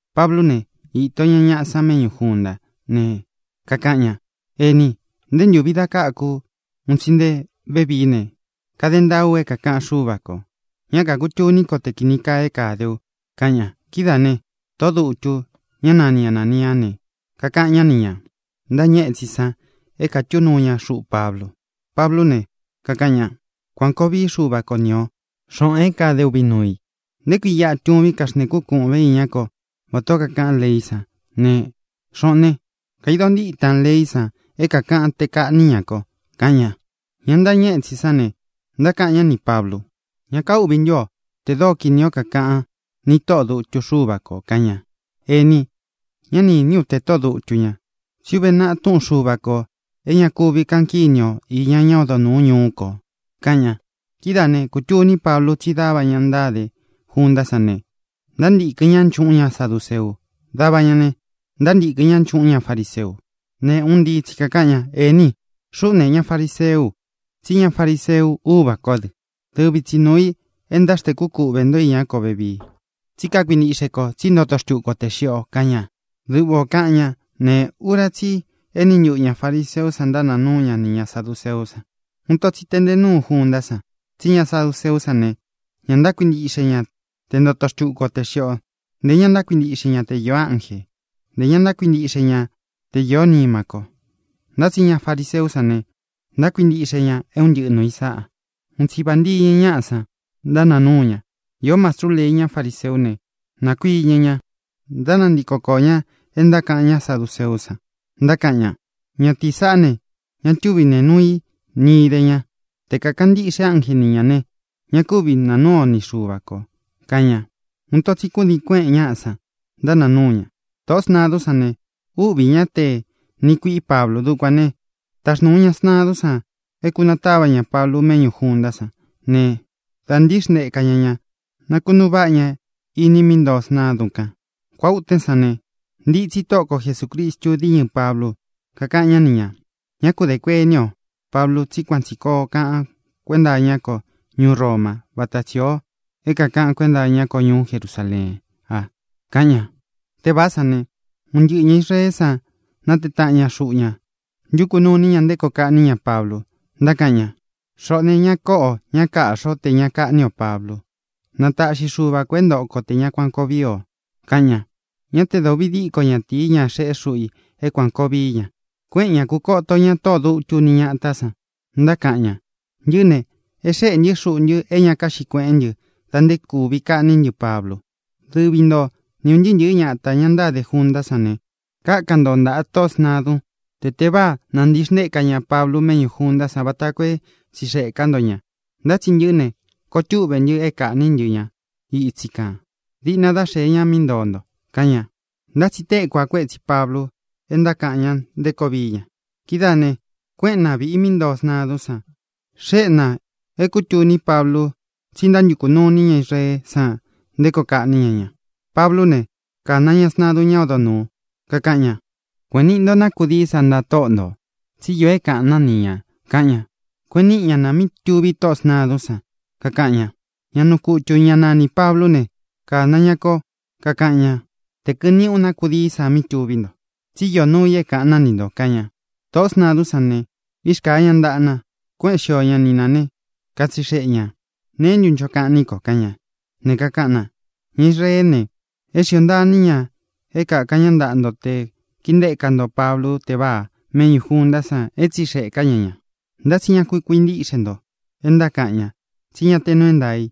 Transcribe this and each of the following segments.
Pablú ne, īto ña ñaꞌa san méꞌñū juntá ne, kakaꞌan ña: —Ēní, nté ntūvi da káku ú un tsi nté vevií ne, kade ntaá u é kākaꞌan Xúva kō. Ñá kākutuní ko te kīni kaa é kade u —kaꞌan ña. Kidáā ne, tóꞌō dutu, ñá nani Anāniá ne, kakaꞌan ñá nī ña ntáñɨ étsin san é kātú nuu ña xuꞌu Pablu. Pablú ne, kakaꞌan ña: —¡Kuān koo vií Xuva ko ni o, xōꞌon é kāden uvi nuu i! ¿Nté kui iꞌa tuvín kaxntēkún kūꞌven iñá ko vatā ó kakaꞌan leí san ne, xōꞌón ne, kaidon ntítan leí san é kākaꞌan te kaꞌní ña ko? —kaꞌan ña. Ña ntáñɨ étsin sán ne, ntákaꞌan ñá nī Pablu: —¿Ña káuꞌvī ntú o te dóo kini o kākaꞌan ni tóꞌō dutu Xúva kō? —kaꞌan ña. —Ēní, ñá ni īní u te tóꞌō dutu ña. Tsí uve naꞌā Túꞌun Xuva kō é ña kuvi kaꞌan kíni o īña ñá odo nūú ñuu ko —kaꞌan ña. Kidáā né, kūtuní Pablu tsí dava ña ntáde juntá san ne, ntántīkɨn ñá nchuꞌún ña saduceu; dava ña ne, ntántīkɨn ñá nchuꞌún ña fariseu. Ne, un ntii tsi kākaꞌan ña: —Ēní, xuꞌú ne, ña fariseú u, tsí ña fariseu úvā kó dɨ. Dɨvi tsi nuu ī é ntáxntēkú kuꞌvē ntó iñá ko vevii. Tsí kakuintiꞌxe ko tsí ntoto xtúku o tē xiꞌi o —kaꞌan ña. Duꞌva ō kaꞌan ñá ne, ura tsí i eni ntuꞌū ña fariseú san ntánaa núu ña nī ña saduceú san. Uun ito tsi teꞌnte núu juntá san. Tsí ña saduceú san ne, ñá ntákuintiꞌxe ña te ntoto xtuku o tē xiꞌi ó, ntē ña ntákuintiꞌxe ña te īó ánjē. Ntē ña ntákuintiꞌxe ña te īó nima ko. Ntá tsi ña fariseú san ne, ntákuintiꞌxe ña é un ntɨꞌɨ nuū i sáꞌa. Un tsi vāntiñɨ ñaꞌa san, ntánaa núu ña. Īó mastru lei ñá fariseú ne, nākuiñɨ ña, ntánantiko koō ña é ntákaꞌan ña saduceú san, ntákaꞌan ña: —Ñatīí saꞌá ne, ña túvi nee nuu i ni idé ña. Te kākaꞌan ntíꞌxe ánje ni ñā ne, ña kúvi naa núu o ni Xuva kō —kaꞌan ña. Uun ito tsi kúdiin kuéꞌēn ñaꞌa san, ntánaa núu ña. Tōꞌó sntadún san ne, úꞌvī ñá te niꞌi kuiꞌi Pablu. Dukuān ne, táxnūu ña sntadún san é kūnatáva ña Pablu méꞌñū juntá san ne, da ntíxnteka ña ña, nakunuu váꞌa ña iní i mí ntoo sntadún kān. Kuáa ūtén san ne, ntitsí Tóꞌo ko Jesūcristu díñɨ Pablu, kakáꞌan ñá ni ñā: —Ñá ku dē kuení o, Pablu, tsí kuan tsī koo kaꞌan kuénta iñá ko ñuú Roma váta tsī ó é kākaꞌan kuénta iñá ko ñuú Jerusaleén a —kaꞌan ña. Tévāá san ne, uun tɨɨ̄n ña Israeé san nátee taꞌan ña xuꞌu ña, ntukū nuu iní ña nté koo kaꞌní ña Pablu, ntákaꞌan ña: —Xoꞌō ne, ña koꞌo o, ña káꞌxi o tē ña káꞌni o Pablu. Na taꞌxi Xuva kō é ntoꞌo ko tē ña kuan koo víi o —kaꞌan ña. Ñá te da ūvi díko ñatīi, ñá xeꞌé xuꞌu i é kuān koo vií ña. Kuéꞌen ña, kūkoto ña tóꞌō dutu ni ñátā san, ntákaꞌan ña: —Ntɨꞌɨ́ ne, e xéꞌē ntɨ́ xuꞌu ntɨ é ña kaꞌxí kueꞌén ntɨ da nté kūví kaꞌní ntɨ Pablu. Dɨvi nto ni ūn ntɨɨ́ ntɨ̄ɨ́ ñatā, ña ntáde juntá san ne, kákan nto ntāꞌa tóꞌō sntadun te teváa nāntixntéka ña Pablu méꞌñū juntá san vata koo é tsixeꞌē ká nto ña. Ntá tsi ntɨꞌɨ́ ne, koo túꞌve ntɨ é kāꞌní ntɨ ña ítsi kān diꞌna dá xēe ña mí ntoo nto —kaꞌan ña. Ntá tsi téku a kuetsi Pablu é ntákaꞌan ña nté koo vií ña. Kidáā ne, kuéꞌen na vīꞌi mí ntoo sntadún san, xéꞌe nā é kūtuní Pablu tsí ntántukū nuu iní ña Israeé san nté koo kaꞌní ña ña. Pablú ne, kāna ña sntadun ñá odo nūu, kakaꞌan ña: —Kuēꞌen niꞌi nto ná kudií sa ntāꞌa tóꞌo ntō, tsi íō é kāꞌan ná ni ñā —kaꞌan ña. Kueꞌen níꞌi ña na mí tuví tóꞌō sntadún san, kakaꞌan ña: —Ñá nuu kutū, ñá nanī Pablú ne, kāna ña kó, kakaꞌan ñá tē kɨꞌɨn niꞌí u na kudií sa mí tuví nto, tsi íō nuu i é kāꞌan ná ni ntō —kaꞌan ña. Tōꞌó sntadún san ne, írkāa ña ntaꞌa na, kuéꞌen xio ña ni nā né, katsixeꞌe ñā: —¿Neé ntu ncho kaꞌan ní ko? —kaꞌan ña. Ne, kakaꞌan na: —Ña Israeé ne, é xiō ntaa iní ña é kakān ñá ntaꞌa nto te kīntéka nto Pablu teváa méꞌñū junta san é tsixeꞌē ká ña ña. Ntá tsi ña ku kuintíꞌxe nto é ntákaꞌan ña, tsí ña te nuu é ntaā i.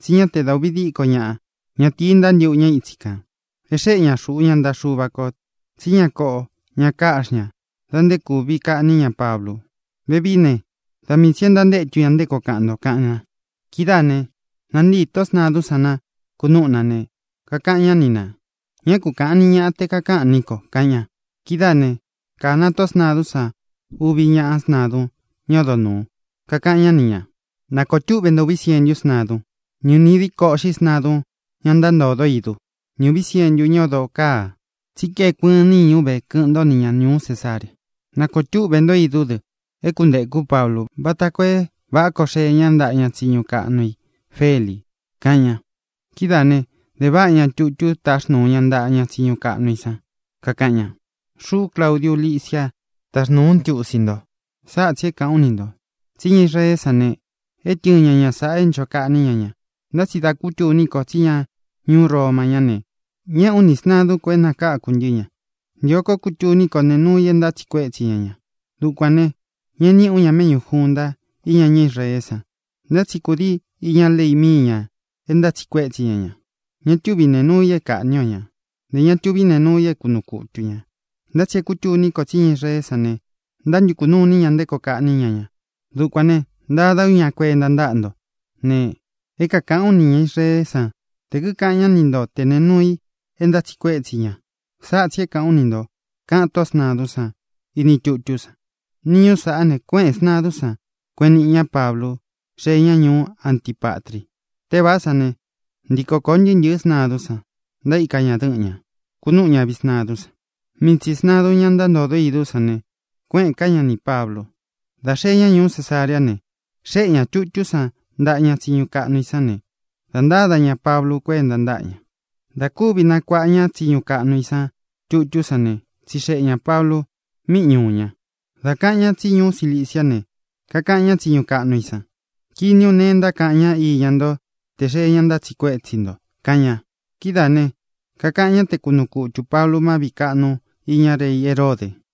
Tsí ña te da uvi díko ñaꞌa ñatīi ntántīꞌu ñá itsi kān. É xēꞌé ña xuꞌu ña ntaꞌa Xuva kō tsí ña kóꞌo, ña káꞌxi ña da nté kūví kaꞌní ña Pablu. Vevií ne, da mii tsī e ntántétu ña nté koo kaꞌan nto —kaꞌan na. Kidáā ne, nantíi tóꞌō sntadún san na, kúnūꞌú na ne, kakaꞌan ñá ni nā: —Ñá ku kāꞌan ni ñaꞌa te kakáꞌan ní ko —kaꞌan ña. Kidáā né, kāna tóꞌō sntadún san uvi ñaꞌá sntadun ñá odo nūu, kakaꞌan ñá ni ñā: —Nākoo túꞌvē ntó uvi sientú sntadun, ni ūni díko uꞌxi sntadun, ñá ntántodó idu, ni ūví sientu ñá odō kaa, tsí kaeku ɨɨn níñu ve kɨꞌɨn ntó ni ña ñūú Cesarea. Nākoo túꞌvē ntó idú dɨ é kuntēkú Pablu, vata koo é vāꞌá koo xee ñá ntaꞌa ña tsiñu kaꞌnu i Feli —kaꞌan ña. Kidáā ne, de váꞌa ña tutú táxnūu ña ntaꞌa ña tsiñu kaꞌnu i san, kakaꞌan ña: “Xuꞌú, Claudiu Lisia, táxnūú u ntiusi nto. Sáꞌa tsī é kāꞌán u ni ntō: Tsí ña Israeé san ne, é tɨɨn ña ña sāꞌa é ncho kaꞌní ña ña. Ntá tsi dá kutuní ko tsí ña ñuú Roma ñá ne, ñéꞌē ú ni sntādún ko é nakākú ntɨ ña. Ntio kó kutuní ko nee núu i é ntátsiꞌi kuétsi ña ña. Dukuān ne, ñeꞌe níꞌī ú ña méꞌñū junta íña ñá Israeé san. Ntá tsi kūdii iña lei íña mii ña é ntátsiꞌi kuétsi ña ña. Ña túvi nēe nuu i é kāꞌní o ñā. Ntē ña tuví nee nuu i é kunuu kutu ñā. Ntá tsi é kūtuní ko tsí ña Israeé san ne, ntántukū nuu iní ña nté koo kaꞌní ña ña. Dukuān ne, ntada ú ña kuenta ntáꞌa nto. Ne, é kākaꞌán u nī ña Israeé san tē kíkaꞌan ñá ni nto te nēe nuu i é ntátsiꞌi kuétsi ña. Sáꞌa tsī é kāꞌán u ni ntō”, kaꞌán tóꞌō sntadún san ini tutú san. Niñú sāꞌá ne, kuéꞌēn sntadún san, kueꞌen niꞌi ñá Pablu. Xee ñá ñuú Antipatri. Tévāá san ne, ntīko koo ntɨɨ́ ntɨ̄ɨ́ sntadún san, ntaíka ña dɨ́ꞌɨn ña, kūnúꞌu ña viꞌi sntadún san. Mii tsī sntadun, ñá ntántōdó idú san ne, kuéꞌēn ká ña nī Pablu. Dā xee ñá ñuú Cesareá ne, xéꞌe ñā tutú san ntaꞌa ña tsiñu kaꞌnu i san ne, dā ntáda ña Pablu kuénta ntáꞌa ña. Dā kúvi nakuaꞌa ña tsiñu kaꞌnu i san tutú san ne, tsixeꞌe ñā Pablu míꞌi ñuū ña. Dā kaꞌan ñá tsi ñuú Ciliciá ne, kakaꞌan ñá tsiñu kaꞌnu i san: —Kini ú nee é ntákaꞌan ña íña nto tē xee ña ntátsiꞌi kuétsi nto —kaꞌan ña. Kidáā ne, kakaꞌan ñá te kunuu kutū Pablu má viꞌī kaꞌnu iña rei Heródē.